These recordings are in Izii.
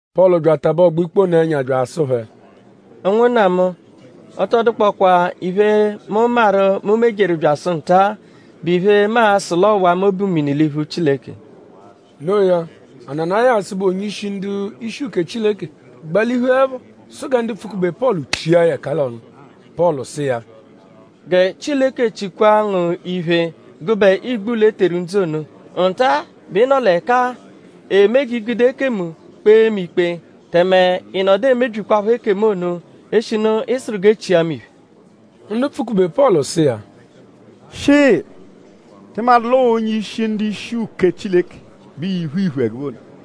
Pọlu bya atabẹ ọgbo-ikpe ono ẹnya bya asụ phẹ: “Ụnwunna mu; ọ tọ dụkpokwaa iphe, mu maru, mu mejeru byasụ nta-a, bụ iphe, mu a-sụ l'ọowa mu obu mini l'iphu Chileke.” Noo ya; Ananayasu, bụ onye-ishi ndu-ishi uke Chileke gbalihuẹpho sụ gẹ ndu pfụ-kube Pọlu chia ya ẹka l'ọnu. Pọlu sụ iya: “Gẹ Chileke chikwa ngu iphe gụbe igbulọ, e teru ńdzú ono! Nta-a bẹ ị nọ l'ẹka-a eme g'i gude ekemu kpee mu ikpe; tẹme ị nọdu emebyikwaphọ ekemu ono; eshinu ị sụru g'e chia mu iphe.” Ndu pfụ-kube Pọlu sụ iya: “Shịi!?Tị madụ l'ọo onye-ishi ndu-ishi uke Chileke bẹ ịiphu iphu ẹgube ono?”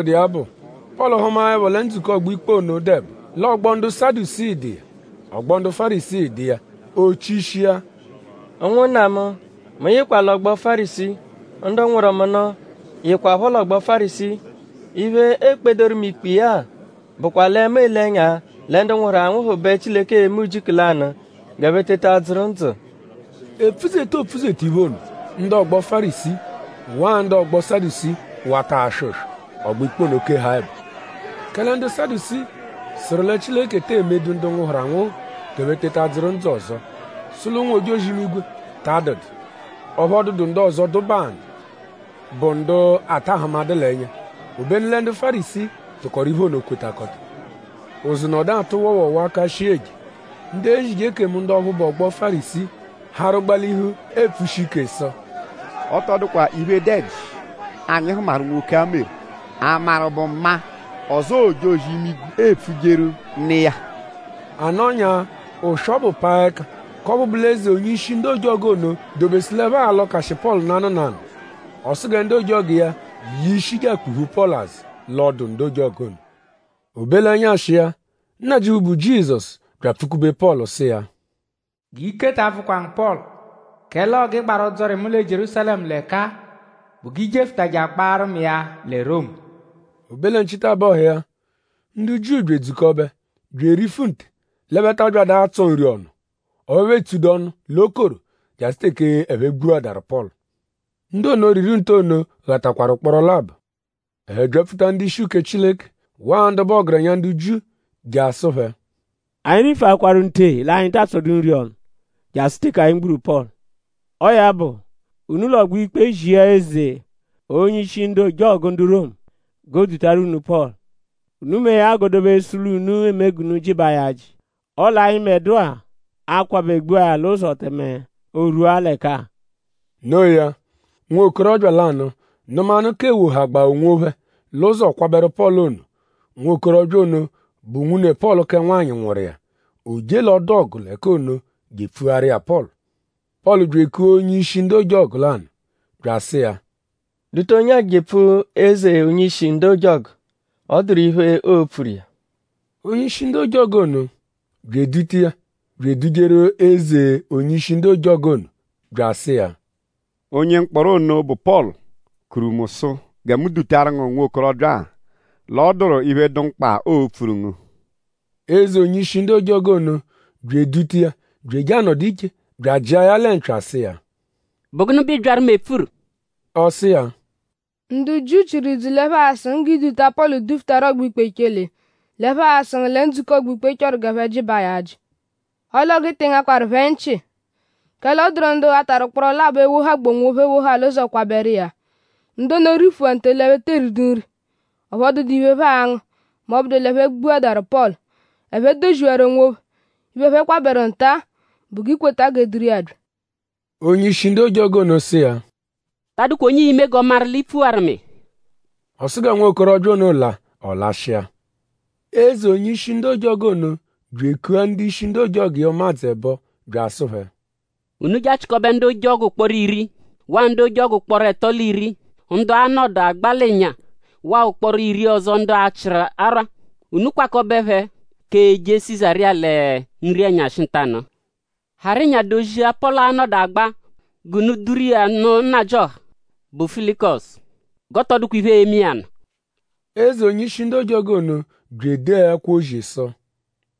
“Tọbudu iya bụ; Pọlu hụmaepho lẹ ndzukọ ọgbo-ikpe ono dụ ẹbo; l'ọgbo ndu Sadusii dụ iya; ọgbo ndu Fárisii dụ iya; o chishia: Ụnwunna mu; mu yịkwa l'ọgbo Fárisii. Ndu nwụru mu nụ yịkwapho l'ọgbo Fárisii. Iphe, e kpedoru mu ikpe iya-a bụkwa lẹ mu ele ẹnya lẹ ndu nwụhuru anwụhu bẹ Chileke e-me ujiku lanụ g'ẹphe teta dzụru ndzụ.” Epfuzeta, oopfuzeta iphe ono; ndu ọgbo Fárisii waa ndu ọgbo Sadusii wata aswọ ụswo. Ọgbo-ikpe keha ẹbo. Kẹle ndu Sadusii sụru lẹ Chileke tee medu ndu nwụhuru anwụhu g'ẹphe teta dzụru ndzụ ọzo; sụ l'ụnwu-ojozi-imigwe ta adụdu; ọphu ọ dụdu ndu ọzo, dụbaa nụ, bụ ndu a ta ahụmadu l'ẹnya. Obenu lẹ ndu Fárisii tụkoru iphe ono kwetakọta. Ụzu nọdu atụ wọowoowoo aka shii eje. Ndu ezije ekemu ndu ọphu bụ ọgbo Fárisii harụ gbalihu epfushi ike sụ: “Ọ tọ dụkwa iphe, dụ ẹji, anyi hụmaru, nwoke-a meru!?A maru bụ maa; ọzoo ojozi-imigwe epfujeru nụ iya.” A nọnyaa; ụswo ọbu paa ẹka k'ọphu eze onye-ishi ndu ojọgu ono dobesu l'ẹphe a-lọkashi Pọlu nanụ nanụ. Ọ sụ gẹ ndu ojọgu iya ye ishi je akpuphu Pọlu azụ l'ọdu ndu ojọgu ono. O be l'ẹnyashi iya; Nnajịuphu, bụ Jizọsu bya apfụ-kube Pọlu sụ iya: “G'ike ta abvụkwa ngu Pọlu! Kẹle ọo g'ị gbaru ọdzori mu lẹ Jierúsalẹmu l'ẹka-a bụ g'i jefụtaje agbaarụ mu iya lẹ Romu.” O be lẹ nchitabọhu iya; ndu Jiu bya edzukọbe bya erifu nte l'ẹphe ta abyadụ atsọ nri ọnu; ọphu ẹphe etsudu ọnu l'okoro jasụ teke ẹphe gbuadaru Pọlu. Ndu ono, riru nte ono ghatakwaru ụkporo labọ. Ẹphe byapfuta ndu-ishi uke Chileke waa ndu bụ ọgerenya ndu Jiu je asụ phẹ: “Anyi rifuakwaru nte l'anyi taa tsọdu nri ọnu jasụ teke anyi gburu Pọlu. Ọo ya bụ; unu l'ọgbo-ikpe zia eze onye-ishi ndu ojọgu ndu Romu g'o dutaru unu Pọlu. Unu mee ya g'o dobesu l'unu eme g'unu jịbaa ya ajị. Ọle anyịbedua a-kwabẹ gbua ya l'ụzo; tẹme l'o rwua ẹka-a.” Noo ya; nwokorọbya lanụ nụmanu k'ewohagbaa onwophẹ l'ụzo kwabẹru Pọlu ono. Nwokorọbya ono bụ nwune Pọlu kẹ nwanyị nwụru iya. O je l'ọdu-ọgu l'ẹka ono je epfuaru iya Pọlu. Pọlu bya ekua onye-ishi ndu ojọgu lanụ bya asụ iya: “Duta onye-a jepfu eze onye-ishi ndu ojọgu. Ọ dụru iphe, oo-pfuru iya.” Onye-ishi ndu ojọgu ono bya eduta iya bya edujeru eze onye-ishi ndu ojọgu ono bya asụ iya: “Onye mkpọro ono, bụ Pọlu kuru mu sụ gẹ mu dutaru ngu nwokorọbya-a l'ọ dụru iphe, dụ mkpa, oo-pfuru ngu.” Eze onye-ishi ndu ojọgu ono bya eduta iya bya eje anọdu iche bya ajịa ya lẹ mpya sụ iya: “?Bụ gụnu bẹ ị byaru mu epfuru?” Ọ sụ iya: “Ndu Jiu chịru idzu l'ẹphe a-sụ ngu g'i duta Pọlu dufutaru ọgbo-ikpe echele. L'ẹphe aa-sụ ngu lẹ ndzukọ ọgbo-ikpe achọ g'ẹphe jịbaa ya ajị. Ọle ọo g'ị tị ngakwaru phẹ nchị; kẹle ọ dụru ndu ghatarụ ụkporo labọ e-wohagbaa onwophẹ ewoha l'ụzo kwabẹru iya. Ndu ono rifuwaru nte l'ẹphe tee ridu nri; ọphu ọ dụdu iphe, ẹphe a-ngụ m'ọ bụdu l'ẹphe gbuadaru Pọlu. Ẹphe doziwaru onwophẹ. Iphe, ẹphe kwabẹru nta-a bụ g'i kweta g'e duru iya bya.” Eze onye-ishi ndu ojọgu ono sụ iya: “Ta adụkwa onye ii-me g'ọ maru l'i pfuwaru mu iya.” Ọ sụ gẹ nwokorọbya ono la. Ọ lashịa. Eze onye-ishi ndu ojọgu ono bya ekua ndu-ishi ndu ojọgu iya ụmadzu ẹbo bya asụ phẹ: “Unu je achịkobe ndu ojọgu ụkporo iri; waa ndu ojọgu ụkporo ẹto l'iri; ndu a-nọdu agba l'ịnya; waa ụkporo iri ọzo ndu a-chịru arwa. Unu kwakọbe phẹ k'eje Sizariya lẹ nri-ẹnyashi ntanụ-a. Harụ ịnya dozia, Pọlu a-nọdu agba g'unu duru iya nụ nnajịoha, bụ Felikusu. G'ọ tọ dụkwa iphe, e-me iya nụ.” Eze onye-ishi ndu ojọgu ono bya edee ẹkwo-ozi sụ: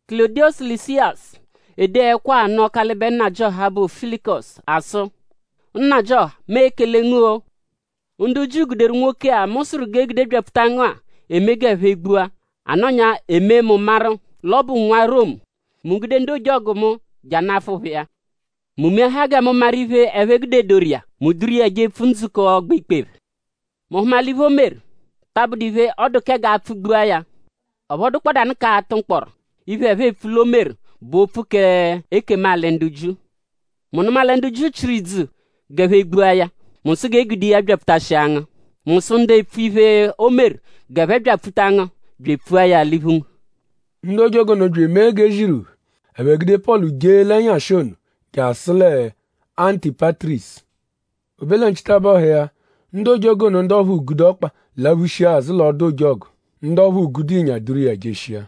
“Kulọdiyosu Lịsiyasu ede ẹkwo-a anụ Ọkalibe Nnajịoha, bụ Felikusu asụ: Nnajịoha; mu ekele ngu-o. Ndu Jiu guderu nwoke-a, mu sụru g'e gude byapfuta ngu-a eme g'ẹphe gbua. A nọnyaa e mee mu maru l'ọ bụ nwa Romu. Mu gude ndu ojọgu mu je anafụ phẹ iya. Mu meahaa gẹ mu maru iphe, ẹphe gudedoru iya. Mu duru iya jepfu ndzukọ ọgbo-ikpe phẹ. Mu hụma l'iphe, o meru ta abụdu iphe, ọ dụ kẹ g'a pfụ-gbua ya; ọphu ọ dụkpodanu k'atụ mkpọro. Iphe, ẹphe epfu l'o meru bụ opfu k'ekemu-alị ndu Jiu. Mu nụma lẹ ndu Jiu chịru idzu g'ẹphe gbua ya; mu sụ g'e gude iya byapfutashia ngu. Mu sụ ndu epfu iphe, o meru g'ẹphe byapfuta ngu bya epfua ya l'iphu ngu.” Ndu ojọgu ono bya emee g'e ziru phẹ. Ẹphe gude Pọlu jee l'ẹnyashi ono jasụ lẹ Antipatirisu. O be lẹ nchitabọhu iya; ndu ojọgu ono ndu ọphu gude ọkpa laphushia azụ l'ọdu-ojọgu. Ndu ọphu gude ịnya duru iya jeshia.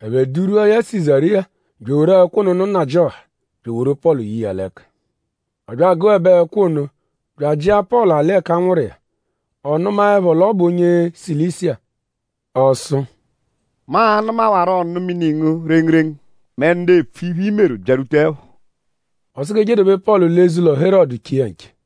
Ẹphe durwua ya Sizariya bya eworu ẹkwo ono nụ nnajịoha bya eworu Pọlu ye iya l'ẹka. Ọ bya agụebe ẹkwo ono; bya ajịa Pọlu alị ẹka a nwụru iya. Ọ nụmaepho l'ọ bụ onye Silisiya; ọ sụ: “Mu a-nụmawaro ọnu-mini ngu rengurengu mẹ ndu epfu iphe, i meru byarwutaẹpho.” Ọ sụ g'e je dobe Pọlu l'eze-ụlo Herọdu che iya nche.